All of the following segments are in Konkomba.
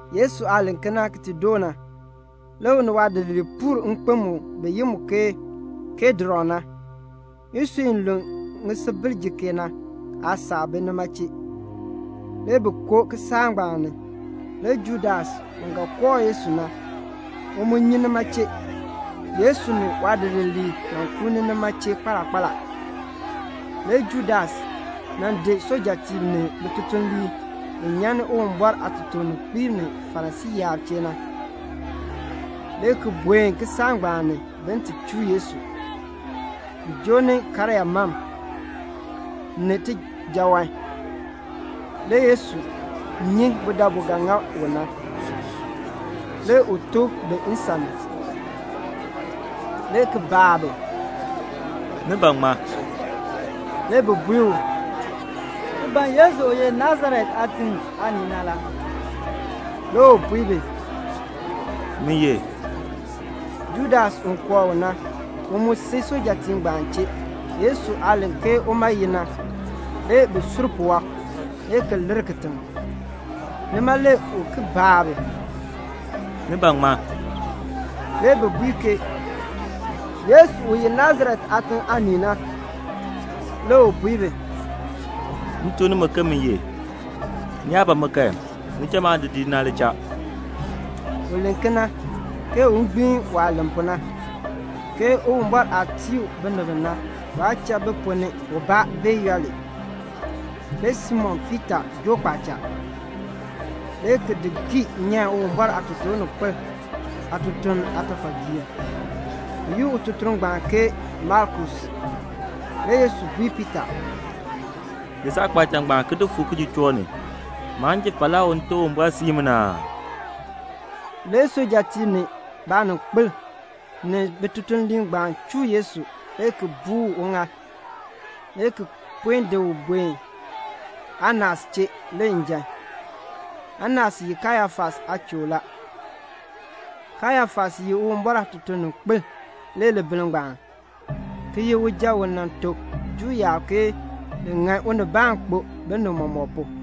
Yesu aah len kena ki ti doo na, le u ni waadidiliib puur nkpen mu bi yi mu ke Kidron na. Isui i lu ŋisubil jikee na aasaak bi nima chee. Le bi koo kisaak ngbaan ni. Le Judas, u ga kooh Yesu na, u mu nyi nima chee; Yesu ni waadidiliib nan kuuni nima chee kpaala kpaala. Le Judas nan di sujatiib ni bitutuliib bi nyan ni Uwumbɔr aatotoorninkpiib ni Farisii yaab chee na, le ki buen kisaak ngbaan ni bin ti chuu Yesu. Bi joo ni karyaa mam, ni tijaawan. Le Yesu nyi budabu ga ŋa u na. Le u tooh bi nsan ni, le ki baa bi, "Ni ban ŋmaa?" Le bi bui u, "Ti ban Yesu u ye Nasaret aatiŋ aanii na la." Le u bui bi, "Min ye." Judas u kooh u na, u mu si sujatiib ngbaan chee. Yesu aah len ke uma ye na, le bi sur puwɔb, le ki lir kitiŋ. Nima le u ki baa bi, "Ni ban ŋmaa?" Le bi bui ke, "Yesu u ye Nasaret aatiŋ aanii na." Le u bui bi, "M tuk nimi ke min ye. Ni yaa ban mi kan, ni cha maadidiliib na li cha." (U len kena, ke un gbiin waah len pu na, ke Uwumbɔr aah tii u binib bi na, waa cha bi ponn ni ubaa bee yooli.) Le Simon Piita joo kpaacha, le ki di gii nyan Uwumbɔr aatotoorninkpil aatutuln aatafalgiir. Bi yi ututuln ngbaan ke Malkus. Le Yesu bui Piita, "Di saakpaacha ngbaan ki di fu kijuchook ni. Maan ji falaa u Nte Uwumbɔr siin mi na aa?" Le sujatiib ni baaninkpil ni bitutuliib ngbaan chuu Yesu le ki buu uŋaal, le ki pue di u di buen Anas chee le njan. Anas ye Kayafas aachoor la. Kayafas ye Uwumbɔr aatotoorninkpil le libiln ngbaan, ki ye uja u nan tuk Juu yaab ke ni ŋan unibaan kpo binib mɔmɔk pu.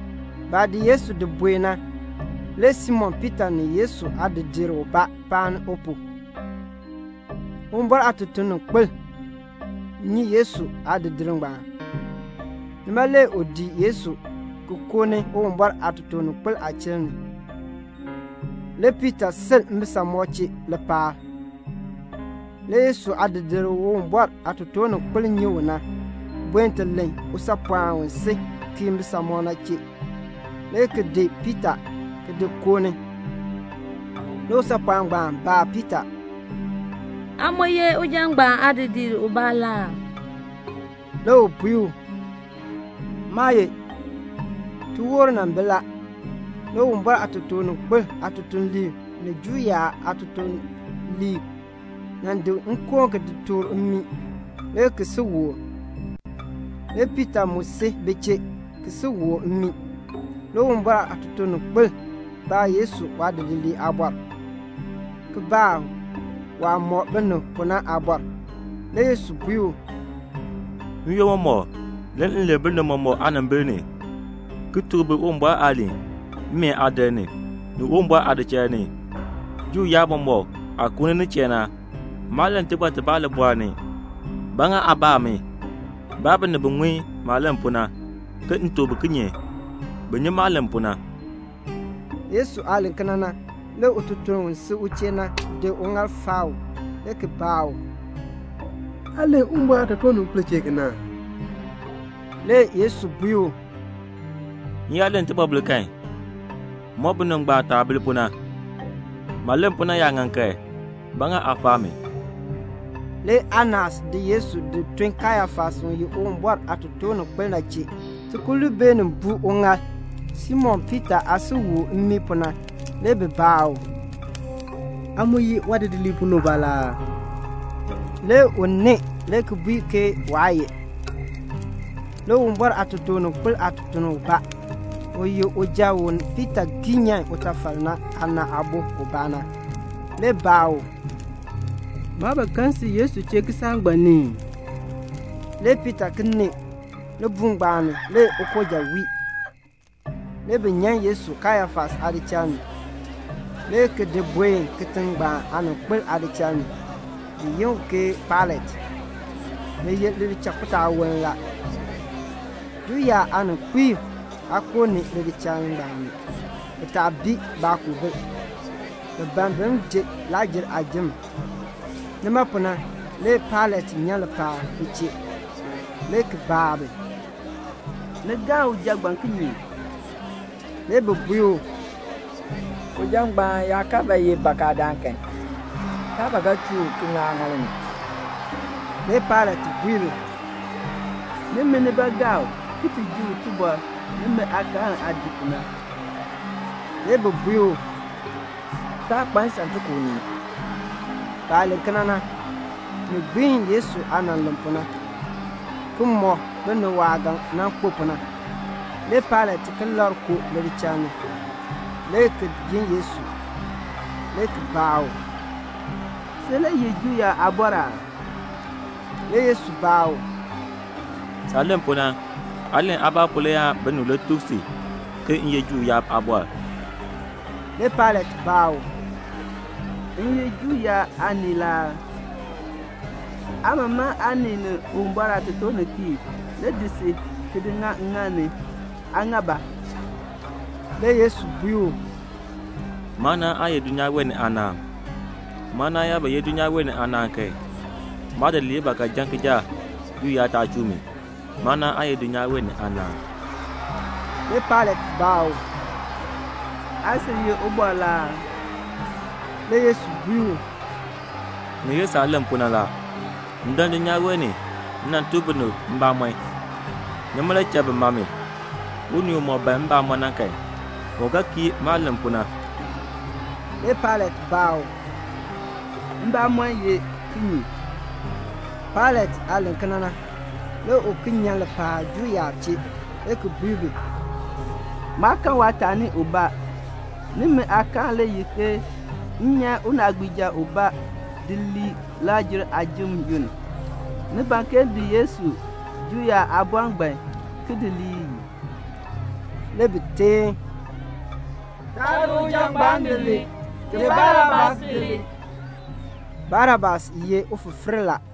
Baah di Yesu di buen na, le Simon Piita ni Yesu aadidiir ubaa paan u pu. Uwumbɔr aatotoorninkpil nyi Yesu aadidiir ngbaan. Nima le u dii Yesu ki koo ni Uwumbɔr aatotoorninkpil aachiln ni. Le Piita sil mbisamɔb chee lipaal. Le Yesu aadidiir u Uwumbɔr aatotoorninkpil nyi u na, buen ti len usaapɔɔn u si kii mbisamɔb na chee, le ki di Piita ki di koo ni. Le usaapɔɔn ngbaan baa Piita, "Aa mu ye uja ngbaan aadidiir ubaa la aa?" Le u bui u, "Maa ye." Tiwoor nan bi la. Le Uwumbɔr aatotoorninkpil aatutuliib ni Juu yaab aatutuliib nan di nkoon ki di tuur mmii, le ki si wol. Le Piita mu si bi chee, ki si wol mmii. Le Uwumbɔr aatotoorninkpil baa Yesu waadidiliib aabɔr, ki baa u waah mɔk binib pu na aabɔr. Le Yesu bui u, "N-yoonn mɔmɔk, le m len binib mɔmɔk aanimbil ni, ki tuk bi Uwumbɔr aaliin, mmeen aadir ni, ni Uwumbɔr aadichal ni, Juu yaab mɔmɔk aah kuuni nin chee na. Maa len tibɔr tibaa libɔɔl ni. Ba ŋa aa baa mi? Baa binib bi ŋun maah len pu na, ke m tuk bi kinye. Bi nyi maah len pu na." Yesu aah len kena na, le ututuln u si u chee na di uŋaal faa u, le ki baa u, "Aa len Uwumbɔr aatotoorninkpil chee kena aa?" Le Yesu bui u, "M yaa len tibɔbil kan, mɔk binib ngbaan taah bir pu na. Maah len pu na yaa ŋan kan, ba ŋa aa faa mi?" Le Anas di Yesu di tun Kayafas u ye Uwumbɔr aatotoorninkpil na chee. Tikululn beenin buu uŋaal. Simon Piita aah si wol mmii pu na, le bi baa u, "Aa mu ye waadidiliib ponn ni ubaa la aa?" Le u nee le ki bui ke waa ye. Le Uwumbɔr aatotoorninkpil aatutuln ubaa, u ye uja u Piita gii nyan utafal na aana aabo ubaa na, le baa u, "Maa ba kan si Yesu chee kisaak ngbaan ni ii?" Le Piita ki nee. Libuul ngbaan ni le ukooja wii. Le bi nyan Yesu Kayafas aadichal ni, le ki di buen kitiŋ ngbaan aaninkpil aadichal ni, bi yi u ke Pailat. Ni ye lichakpitaawoln la. Juu yaab aaninkpiib aa koo ni lidichal ngbaan ni, bi taa bii baakoobil; bi ban bin ji Lakr-jer aajim. Nima pu na le Pailat nyan lipaal bi chee, le ki baa bi, "Ni galn uja ngbaan kinye?" Le bi bui u, "Uja ngbaan yaa kaa ba ye bakadaan kan, taa ba ga chuu u ki ŋa aaŋaal ni." Le Pailat bui bi, "Nimi nibaa gaa u ki ji u tibɔr nimi aakaal aah dii pu na." Le bi bui u, "Taa kpa nsan ti ku unii." Baah len kena na, ni gbiin Yesu aah nan len pu, ki mɔk binib waah ga nan kpo pu na. Le Pailat ki labr koo lidichal ni. le ki yi Yesu, le ki baa u, "Sin le ye Juu yaab aabɔr aa?" Le Yesu baa u, "Saah len pu na, aa len aabaa pu le aan binib le tuk si ke m ye Juu yaab aabɔr." Le Pailat baa u, "M ye Juu yaab aanii la aa? Aa mamaŋ aanib ni Uwumbɔr aatotoorninkpiib le di si, ki di ŋa ŋŋaal ni. Aa ŋa ba?" Le Yesu bui u, "Maanaan aa ye dulnyaa wee ni aanaan. Maanaan yaa ba ye dulnyaa wee ni aanaan kan, maadidiliib ba ga jan kijaak, Juu yaab taa chuu mi. Maanaan aa ye dulnyaa wee ni aanaan." Le Pailat baa u, "Aa sil ye ubɔr la aa?" Le Yesu bui u, "Ni ye saah len pu na la. M dan dulnyaa wee ni, m nan tuk binib mbamɔn. Nima le cha bi ma mi. Unii umɔk ban mbamɔn na kan, u ga kii maah len pu na." Le Pailat baa u, "Mbamɔn ye kinye?" Pailat aah len kena na, le u ki nyan lipaal Juu yaab chee, le ki bui bi, "Maa kan waataani ubaa. Nimi aakaal le ye ke m nyan unaagbiija ubaa di lii Lakr-jer aajim yoonn. Ni ban ke m di Yesu, Juu yaab Aabɔr ngbaan, ki di lii ii?" Le bi teen, "Taa di uja ngbaan di lii. Di Barabas di lii." (Barabas nan ye ufifiir la.)